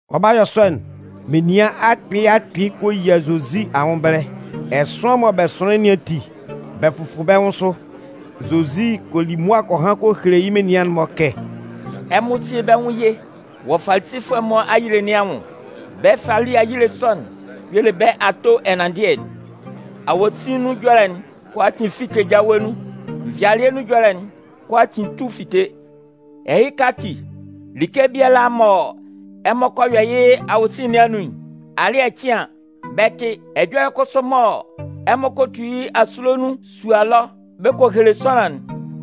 Ɔ 'ba yɔ sɔ'n, menian akpɩɩ akpɩɩ kɔ yia Zozi anwʋn ɛbɛlɛ. Ɛsʋan mɔ bɛ sʋnlɩn nɩn ati, bɛ fʋfʋ bɛ́ nwʋn sʋ. Zozi kɔ li mʋa kɔ han kɔ hele yɩ́ menian'n-mɔ kɛ: “Ɛmɔ síe bɛ́ nwʋn ye wɔ Falisifʋɛ'n-mɔ fali ayile nɩn anwʋn. Bɛ́ fali ayile sɔ'n y'ɔ le bɛ́ ato ɛnanndɩɛ'n. Awosin nun ɛjɔlɛ'n kʋalaatin 'fite jawe nun. Nvɩalɩɛ nun ɛjɔlɛ'n kʋalaatin 'tu fite. Ɛhɩka ati, like kʋalaa mɔ ɛmɔ kɔ yɔ yɩ́ awosin nɩn anun'n, alɩ́ɛ cɩn an, bɛ 'tɩ. Ɛjɔlɛ kʋsʋ mɔ ɛmɔ kɔ tu yɩ́ asule nun sua ɛlɔ bɛ kɔ hele sʋanlan'n,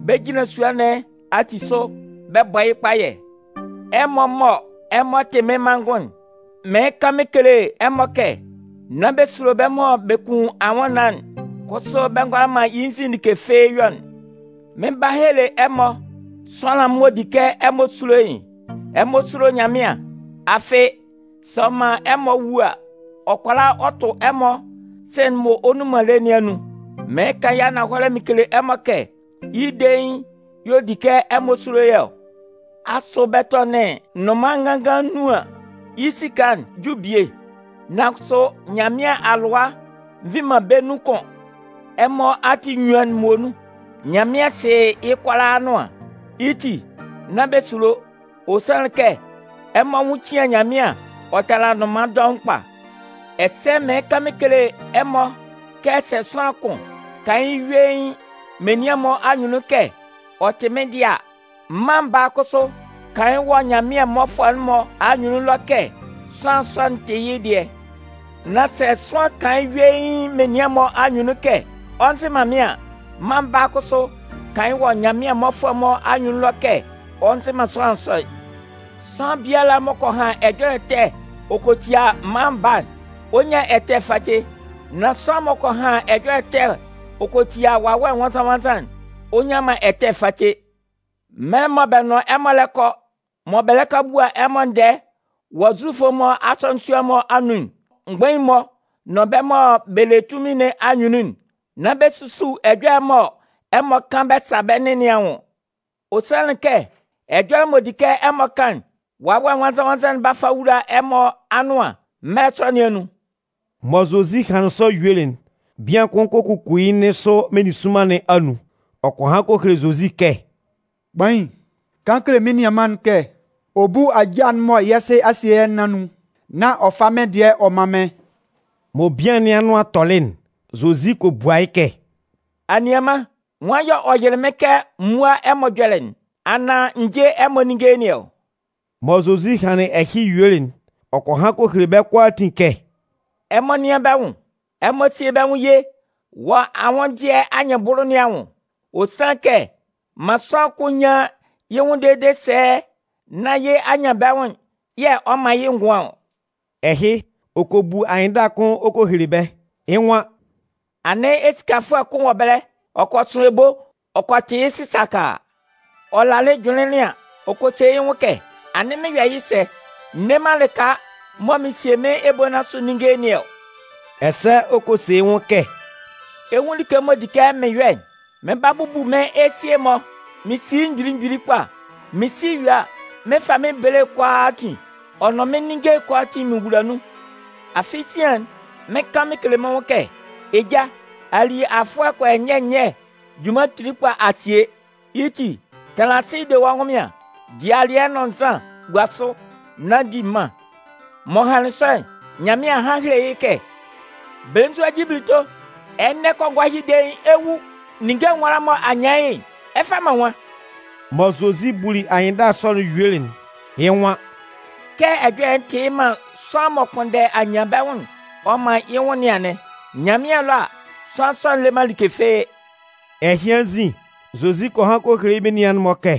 bɛ 'jinlan sua'n-mɔ ati asʋ bɛ bɔ yɩ́ kpayɛ. “Ɛmɔ mɔ ɛmɔ tɩ mɩ́n manngʋn'n, mɩɩn kan mɩn kele ɛmɔ kɛ: nán bɛ sulo bɛ́ mɔ bɛ kun anwʋnnaan'n kʋsʋ bɛ ngʋala man yɩ́ nzin like fɩ́ɩ́ yɔ'n. Mɩn 'ba hele ɛmɔ sʋanlan'n m'ɔ di kɛ ɛmɔ sulo yɩ́'n: Ɛmɔ súlo Nyanmɩan. Afɩ, sɛ ɔ man ɛmɔ wu a, ɔ kʋala ɔ tʋ ɛmɔ sɩ̂n'n m'ɔ nnun man lé nɩn anun. Mɩɩn kan yɩ́ ananhɔlɛ mɩn kele ɛmɔ, yɩ́ dein y'ɔ di kɛ ɛmɔ sulo yɩ́ ɔ! Asʋ bɛ tɔnɩn nnʋnman nganngan nnun an, yɩ́ esika'n ju bie? Nan kʋsʋ Nyanmɩan a lʋa nvi man bɛ́ nun kʋn. Ɛmɔ ati enyuan'n muonun, Nyanmɩan sɩ yɩ́ kʋalaa anʋan. Yɩ́ ti, nán bɛ sulo, ɔ sanlɩn kɛ ɛmɔ anwʋn cɩan Nyanmɩan ɔ tala nnʋnman dɔʋn kpa. “Ɛsɛ mɩɩn kan mɩn kele ɛmɔ kɛ sɛ sʋanlan kʋn kan yɩ́ yuein menian'n-mɔ anyunnun kɛ ɔ tɩ mɩ́n dɩɛ a, Mân Baa'n kʋsʋ 'kan wɔ Nyanmɩan mmɔfʋɛ'n-mɔ anyunnun ɛlɔ kɛ sʋanlan sɔ'n tɩ yɩ́ dɩɛ. Nan sɛ sʋanlan kʋn kan yɩ́ yuein menian'n-mɔ anyunnun kɛ ɔ nzɩ man mɩ́n a, Mân Baa'n kʋsʋ 'kan wɔ Nyanmɩan mmɔfʋɛ'n-mɔ anyunnun ɛlɔ kɛ ɔ nzɩ man sʋanlan sɔ'n. Sʋanlan biala m'ɔ kɔ han ɛjɔlɛ ɛtɛ ɔ kɔ tia Mân Baa'n, ɔ 'nyan ɛtɛ face. Nan sʋanlan m'ɔ kɔ han ɛjɔlɛ ɛtɛ ɔ kɔ tia Wawɛ Nwannzan-nwannzan'n, ɔ nnyan man ɛtɛ face. “Mɛlɛ mɔ bɛ nʋn ɛmɔ kɔ hɔ, mɔ bɛ lɛ kɔ a bua ɛmɔ ndɛɛ wɔ Zufʋ'n-mɔ asɔnɩn sua'n-mɔ anun, mgbain'n-mɔ nʋn bɛ́ mɔ bɛ le tunmin nɩn anyunnun'n, nán bɛ susu ɛjɔlɛ'n mɔ ɛmɔ 'kan bɛ sa bɛ́ nɩn nɩn anwʋn. Ɔ sanlɩn kɛ, ɛjɔlɛ m'ɔ di mɔ ɛmɔ 'kan'n, Wawɛ Nwannzan-nwannzan'n 'ba fa wula ɛmɔ anʋan mɛlɛ sɔ nɩn anun.” Mɔ Zozi hanlɩn sɔ yuelɩ'n, bian kʋn kɔ kuku yɩ́ nɩn sʋ meninsʋnman nɩn anun. Ɔ kɔ han kɔ hele Zozi kɛ: “Kpain, kan kele mɩ́n nianman'n kɛ ɔ bú ajâ'n mɔ yɛ́ sɩ a sie yɛ́ nɩn anun, nán ɔ fá mɩ́n dɩɛ'n ɔ mán mɩ́n.” Mɔ bian nɩn anʋan tɔlɩ'n, Zozi kɔ bua yɩ́ kɛ: “Anianman, nwan yɛ̂ ɔ yɩlɩ mɩ́n kɛ m múa ɛmɔ ɛjɔlɛ'n, anaan n jé ɛmɔ ninnge nɩn ɔ?” Mɔ Zozi hanlɩn ɛhɩ yuelɩ'n, ɔ kɔ han kɔ hele bɛ́ kʋalaatin kɛ: “Ɛmɔ nɩ́an bɛ́ nwʋn! Ɛmɔ síe bɛ́ nwʋn ye wɔ anwʋndɩɛ anyɩnbʋlʋ nɩn anwʋn. Ɔ sanlɩn kɛ man sʋanlan kʋn nyán yɩ́ nwʋn dede sɛɛ, nán yɩ́ anyanbɛnwʋn'n yɛ̂ ɔ man yɩ́ ngʋan ɔ.” Ɛhɩ, ɔ kɔ bu anyɩnndala kʋn ɔ kɔ hele bɛ́. Yɩ́ nwan: “Anɩn esikafʋɛ kʋn wɔ ɛbɛlɛ. Ɔ kɔ sʋn ebo ɔ kɔ tɩ yɩ́ sɩsakaa. Ɔ lalɩ jʋnlɩnlɩn an, ɔ kɔ se yɩ́ nwʋn kɛ: ‘Anɩn mɩn 'yɔ yɩ́ sɛ? N nne man lɩka mɔ mɩn 'sie mɩ́n ebo nɩn asʋ ninnge nɩn ɔ.’ Ɛsɛ ɔ kɔ se yɩ́ nwʋn kɛ: ‘Ɛ 'nwun like m'ɔ di kɛ mɩn yɔ'n. Mɩn 'ba bubu mɩ́n esie'n-mɔ mɩn si yɩ́ mgbili mgbili kpa, Mɩn si ɔ yue a, mɩn 'fa mɩ́n bele'n kʋalaatin ɔ nʋn mɩ́n ninnge'n kʋalaatin mɩn wula nun. Afɩ sian'n, mɩn 'kan mɩn kele mɩ́n nwʋn kɛ: Eja, a li afʋɛ kɔ yɔ nyɛ nyɛ junman kpili kpa a sie. Yɩ́ ti, tanlan asɩ de wɔ́ ɛnwʋnmɩan, di alɩɛ nʋn nzan gua sʋ nán di mân.’ “M'ɔ hanlɩn sɔ'n, nán Nyanmɩan a han a hele yɩ́ kɛ: ‘Belenzua jibilito! Ɛnɛ kɔngɔɛ ɛhɩ dein, ɛ 'wu. Ninnge nwala'n mɔ a nyan yɩ́'n, ɛ 'fa man nwan?’” Mɔ Zozi buli anyɩnndala sɔ'n yuelɩ'n, yɩ́ nwan: “Kɛ ɛjɔlɛ'n tɩ yɩ́ man sʋanlan m'ɔ kpʋnndɛ anyanbɛnwʋn'n ɔ man yɩ́ nwʋn nɩn anɩn. Nyanmɩan ɛlɔ a, sʋanlan sɔ'n le man like fɩ́ɩ́.” Ɛhɩ anzin, Zozi kɔ han kɔ hele yɩ́ menian'n-mɔ kɛ: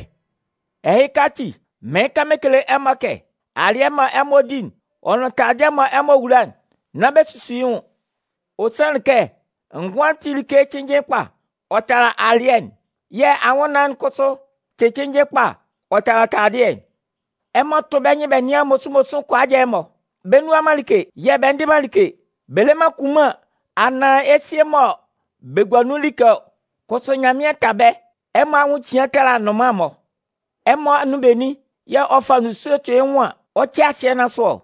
“Ɛhɩka ati, mɩɩn kan mɩn kele ɛmɔ kɛ: alɩɛ'n mɔ ɛmɔ 'di'n ɔ nʋn taladɩɛ'n mɔ ɛmɔ 'wula'n, nán bɛ susu yɩ́ nwʋn. Ɔ sanlɩn kɛ ngʋan'n tɩ like cɩnnjɩn kpa ɔ tala alɩɛ'n. Yɛ̂ anwʋnnaan'n kʋsʋ tɩ cɩnnjɩn kpa ɔ tala taladɩɛ'n. Ɛmɔ tʋ́ bɛ́ nyɩn bɛ nɩ́an mosunmosun kʋajɛ'n-mɔ. Bɛ nnua man like yɛ̂ bɛ ndɩ man like. Bɛ le man kunman anaan esie mɔ bɛ gua nun like ɔ, kʋsʋ Nyanmɩan ta bɛ́. Ɛmɔ anwʋn cian ɔ tala nnʋnman'n-mɔ! Ɛmɔ anun benin yɛ̂ ɔ fa nzusue tʋ yɩ́ nwʋn an, ɔ 'cɛ asɩɛ nɩn asʋ ɔ?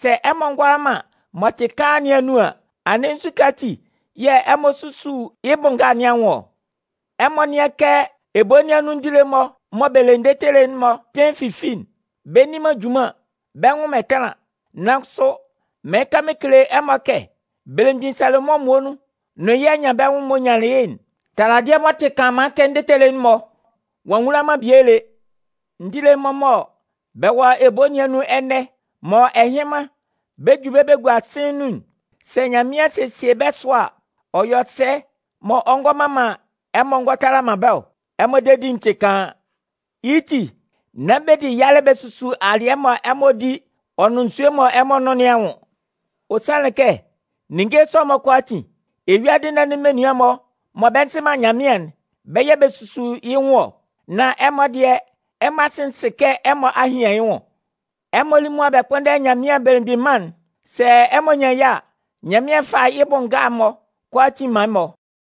Sɛ ɛmɔ ngʋala man m'ɔ tɩ kaan nɩn anun an, anɩn nzukɛ ati yɛ̂ ɛmɔ susu yɩ́ bʋ nga nɩn anwʋn ɔ? “Ɛmɔ nɩ́an kɛ ebo nɩn anun ndile'n-mɔ mɔ bɛ le ndetele'n-mɔ kpɩn fifi'n. Bɛ nni man junman, bɛ nnwʋn man ɛtanlan. Nan kʋsʋ, mɩɩn kan mɩn kele ɛmɔ kɛ belemgbin Salomʋn muonun nʋn yɩ́ anyanbɛnwʋn'n m'ɔ nyanlɩn yɩ́'n, taladɩɛ m'ɔ tɩ kanlanman kɛ ndetele'n-mɔ, ɔ'a nwula man bie lé. Ndile'n-mɔ mɔ bɛ wɔ ebo nɩn anun ɛnɛ, mɔ ɛhɩnman bɛ 'ju bɛ gua sɩ̂n nun'n, sɛ Nyanmɩan sesie bɛ́ sʋa, ɔ yɔ sɛ mɔ ɔ ngo nɩan man ɛmɔ ɔ ngɔ tala man bɛ́ ɔ? Ɛmɔ dedi'n tɩ kaan! Yɩ́ ti, nán bɛ di yalɛ bɛ susu alɩɛ mɔ ɛmɔ di ɔ nʋn nzue mɔ ɛmɔ nʋn nɩn anwʋn. Ɔ sanlɩn kɛ, ninnge sɔ'n-mɔ kʋalaatin, eyuadɩ nɩn anun menian'n-mɔ mɔ bɛ nzɩ man Nyanmɩan'n, bɛ́ yɛ̂ bɛ susu yɩ́ nwʋn ɔ. Nan ɛmɔ dɩɛ, ɛmɔ Asɩ'n sɩ kɛ ɛmɔ a hian yɩ́ nwʋn. Ɛmɔ lí mʋa bɛ kpʋ́nndɛ Nyanmɩan Belemgbin Mân'n. Sɛ ɛmɔ nyan yɩ́ a, Nyanmɩan 'fa yɩ́ bʋ nga'n-mɔ kʋalaatin man ɛmɔ.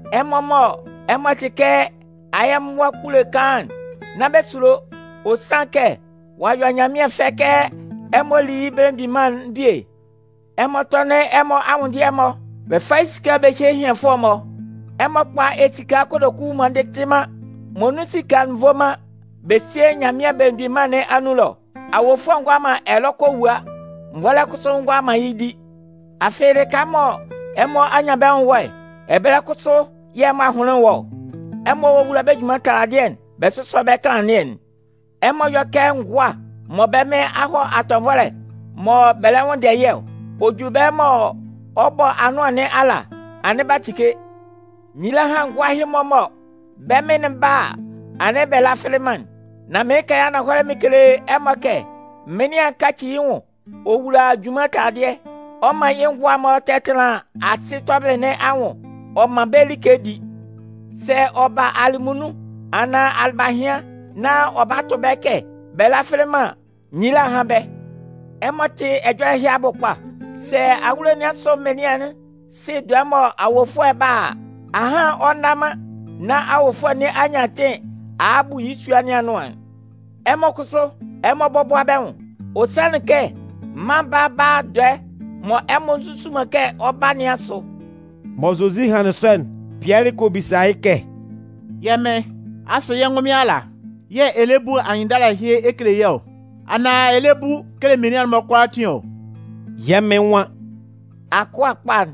Ɛmɔ mɔ ɛmɔ tɩ kɛ ayɛmʋa kpule kaan'n, nán bɛ sulo. Ɔ sanlɩn kɛ ɔ'a yɔ Nyanmɩan fɛ kɛ ɛmɔ lí yɩ́ Belemgbin Mân'n bie. “Ɛmɔ tɔ́nɩn ɛmɔ anwʋndɩɛ'n-mɔ bɛ fá yɩ́ esika'n bɛ hyé ehianfʋɛ'n-mɔ. Ɛmɔ kpá esika kotoku m'ɔ ndɩtɩ man, mɔ nun esika'n nvo man bɛ síe Nyanmɩan Belemgbin Mân nɩn anun ɛlɔ. Awofʋɛ ngʋala man ɛlɔ kɔ kɔ wua, nvɔlɛ kʋsʋ ngʋala man yɩ́ di. Afɩ, lɩka mɔ ɛmɔ anyanbɛnwʋn'n wɔ'n, ɛbɛlɛ kʋsʋ yɛ̂ ɛmɔ ahʋnlɩn'n wɔ ɔ. “Ɛmɔ wówula bɛ́ junman taladɩɛ'n, bɛ sʋ́sɔ bɛ́ kanlannɩɛ'n. Ɛmɔ yɔ́ kɛ ngʋa mɔ bɛ́ mɩn a hɔ atɔnvɔlɛ mɔ bɛ lɛ nwʋnndɛ yɩ́ ɔ. Ɔ ju ɛbɛlɛ mɔ ɔ 'bɔ anʋan nɩn ala, anɩn b'a tike. Nyila hán ngʋa ɛhɩ-mɔ mɔ bɛ́ mɩn 'ba a, anɩn bɛ lafɩlɩ man'n! Mɩɩn kan yɩ́ ananhɔlɛ mɩn kele ɛmɔ kɛ mɩnlɩan'n 'kaci yɩ́ nwʋn ɔ wula junman taladɩɛ. Ɔ 'man yɩ́ ngʋan'n-mɔ tɛtanlan asɩ tɔbɩlɩ nɩn a nwʋn ɔ man bɛ́ like bɛ di. Sɛ ɔ sa ba alɩmunnun anaan alɩbahɩan nán ɔ ba tʋ bɛ́ kɛ bɛ lafɩlɩ man an, nyila hán bɛ́! Ɛmɔ tɩ́ ɛjɔlɛ ɛhɩ abʋ kpa. Sɛ awulo nɩn asʋ mɩnlɩan'n sɩ dɔɛ'n mɔ awofʋɛ'n 'ba a, ahan ɔ nna man nán awofʋɛ nɩn a nyan atɩn a a bu yɩ́ sua nɩn anʋan'n. Ɛmɔ kʋsʋ, ɛmɔ bɔ́bʋa bɛ́ nwʋn. Ɔ sanlɩn kɛ Mân Baa'n 'ba a dɔɛ mɔ ɛmɔ nzusu man kɛ ɔ 'ba nɩn asʋ.” Mɔ Zozi hanlɩn sɔ'n, Pɩɛlɩ kɔ bisa yɩ́ kɛ: “Yɛ́ Mɩn, asʋ yɛ́ ngʋnmɩn ala yɛ̂ ɛ lɛ bu anyɩnndala ɛhɩ ɛ kele yɛ́ ɔ, anaan ɛ lɛ bu kele menian'n-mɔ kʋalaatin ɔ?” Yɛ́ Mɩn nwan: “Akʋa kpa'n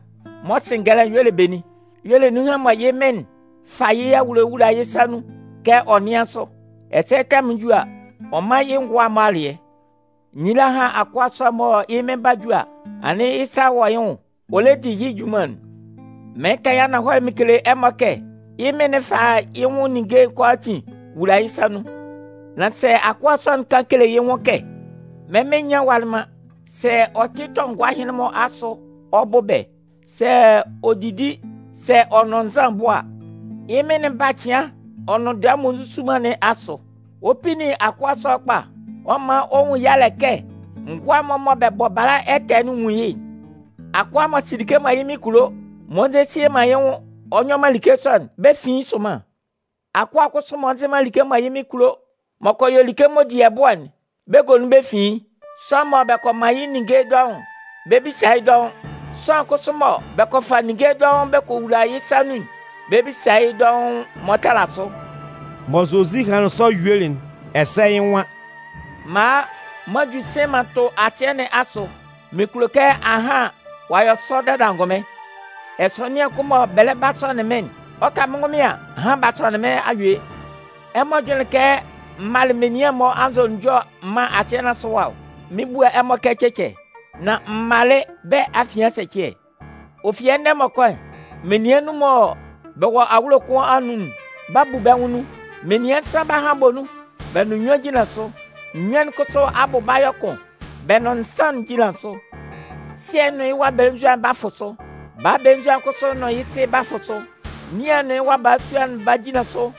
m'ɔ sɩ ngɛlɛ'n y'ɔ le benin? Yɩ́ y'ɔ le nunhan'n mɔ yɩ́ mɩn'n 'fa yɩ́ awulo'n wula yɩ́ sa nun kɛ ɔ nɩ́an sʋ, ɛsɛ tɛmʋn'n ju a, ɔ mán yɩ́ manngʋn'n-mɔ alɩɛ. Nyila hán akʋa sɔ'n mɔ yɩ́ mɩn 'ba ju a, anɩn yɩ́ sa wɔ́ yɩ́ nwʋn ɔ lɛ di yɩ́ junman'n! Mɩɩn kan yɩ́ ananhɔlɛ mɩn kele ɛmɔ kɛ: yɩ́ mɩn'n 'fa yɩ́ nwʋn ninnge'n kʋalaatin wula yɩ́ sa nun. Nan sɛ akʋa sɔ'n kan kele yɩ́ nwʋn kɛ: ‘Mɩ́n mɩn nyanlɩn walɩ man’, sɛ ɔ tɩ tɔ ngʋa ɛhɩnlɩn-mɔ asʋ ɔ bʋ bɛ́, sɛ ɔ didi, sɛ ɔ nʋn nzan ɔ bʋ a, yɩ́ mɩn'n 'ba cɩan ɔ nʋn dɔɛ m'ɔ nzusu man nɩn asʋ. Ɔ 'pinnin akʋa sɔ'n kpa. Ɔ m'an ɔ nwun yalɛ kɛ ngʋa'n-mɔ mɔ bɛ bɔ bala ɛtɛ'n nwun yɩ́'n. “Akʋa m'ɔ sɩ like mɔ yɩ́ mɩn kulo, m'ɔ nzesie man yɩ́ nwʋn ɔ nyɔ man like sɔ'n, bɛ 'fin yɩ́ sʋnman. Akʋa kʋsʋ m'ɔ nzɩ man like mɔ yɩ́ mɩn kulo, m'ɔ kɔ yɔ like sɔ'n m'ɔ di ɛbʋ́ɛ'n, bɛ 'gonun bɛ fin yɩ́. Sʋanlan mɔ bɛ kɔ man yɩ́ ninnge dɔʋn'n, bɛ 'bisa yɩ́ dɔʋn. Sʋanlan kʋsʋ mɔ bɛ kɔ fa ninnge dɔʋn bɛ kɔ wula yɩ́ sa nun'n, bɛ 'bisa yɩ́ dɔʋn m'ɔ tala sʋ.” Mɔ Zozi hanlɩn sɔ yuelɩ'n, ɛsɛ yɩ́ nwan: “M'an a m'an ju sɩ̂n m'an tʋ asɩɛ nɩn asʋ. Mɩn kulo kɛ ahan ɔ'a sɔ dada angʋnmɩn! Ɛsɔnɩan kʋn mɔ bɛ lɛ ba sɔnɩn mɩn'n, ɔ 'ka mɩ́n ngʋnmɩn an, ahan b'a sɔnɩn mɩ́n a yue! Ɛmɔ jʋnlɩn kɛ m malɩ menian'n-mɔ anzʋnunjɔ ɛman asɩɛ nɩn asʋ ɛwa ɔ? Mɩn 'bua ɛmɔ kɛ cɛcɛ, nan m malɩ bɛ́ afian ɛsɛcɩɛ. Ɔ fi ɛnɛ m'ɔ kɔ'n, menian nnun mɔ bɛ wɔ awulo kʋn anun'n 'ba bu bɛ́ nwʋn nun. Menian nsan 'ba han bɔ nun bɛ nʋn nnyuan jinlan sʋ. Nnyuan'n kʋsʋ abʋ 'ba yɔ kʋn bɛ nʋn nsan'n jinlan sʋ. Sɩɛ'n nʋn yɩ́ wa belenzua'n 'ba fʋ sʋ. Baa belenzua'n kʋsʋ nʋn yɩ́ sɩ 'ba fʋ sʋ. Nian'n nʋn yɩ́ wa balasua'n 'ba jinlan sʋ.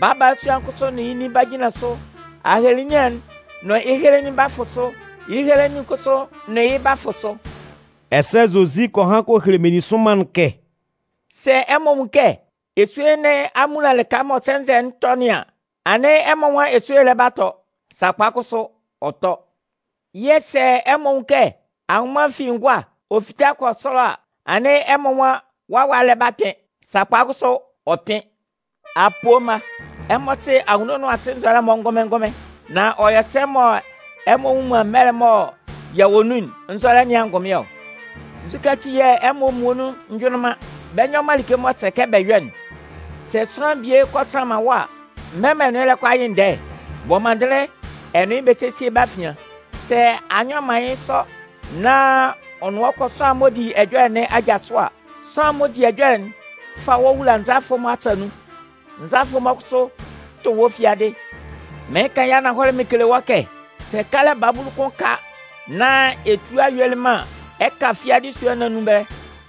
Baa balasua'n kʋsʋ nʋn yɩ́ nin 'ba jinlan sʋ. Ahelenian'n nʋn yɩ́ helenin 'ba fʋ sʋ. Yɩ́ helenin'n kʋsʋ nʋn yɩ́ 'ba fʋ sʋ.” Ɛsɛ Zozi kɔ han kɔ hele meninsʋnman'n kɛ: “Sɛ ɛmɔ nwun kɛ esue nɩn a munlan lɩka mɔ sɛnzɛ'n tɔ nɩn an, anɩn ɛmɔ nwan esue'n lɛ ba tɔ. Sakpa kʋsʋ, ɔ tɔ. Yɛ̂ sɛ ɛmɔ nwun kɛ anwʋnman fi ngʋa ɔ fita kɔ sɔlɔ a, anɩn ɛmɔ nwan wawa'n lɛ ba kpɩn. Sakpa kʋsʋ, ɔ kpɩn. Apoo mma! Ɛmɔ sɩ anwunno nʋn asɩ nzɔlɛ'n-mɔ ngʋnmɩn ngʋnmɩn. Nan ɔ yɔ sɛ mɔ ɛmɔ nnwun man mɛlɛ'n mɔ yɛ wɔ nun'n nzɔlɛ nɩn angʋnmɩn ɔ? “Nzukɛ ati yɛ̂ ɛmɔ muonun njʋnlɩn man, bɛ nyɔ man like m'ɔ sɛ kɛ bɛ yɔ'n? Sɛ sʋanlan bie kɔ sanman wɔ́ a, mɛlɛ mɔ ɛ nʋn yɩ́ lɛ kɔ a yɩ ndɛɛ'n, bɔ mɔndɩnlɩn ɛ nʋn yɩ́ bɛ sésie bɛ́ afian. Sɛ a nyɔ man yɩ́ sɔ nán ɔ nʋn wɔ́ kɔ sʋanlan'n m'ɔ di ɛjɔlɛ nɩn aja sʋ a, sʋanlan'n m'ɔ di ɛjɔlɛ'n 'fa wɔ́ wula nzalafʋ'n-mɔ asa nun. Nzalafʋ'n-mɔ kʋsʋ 'tʋ wɔ́ fiadɩ. Mɩɩn kan yɩ́ ananhɔlɛ mɩn kele wɔ́ kɛ, sɛ kalɛ babulu kʋn ka nán ɛ tualɩ yuelɩ man an, ɛ 'ka fiadɩ sua nɩn anun ɛbɛlɛ.”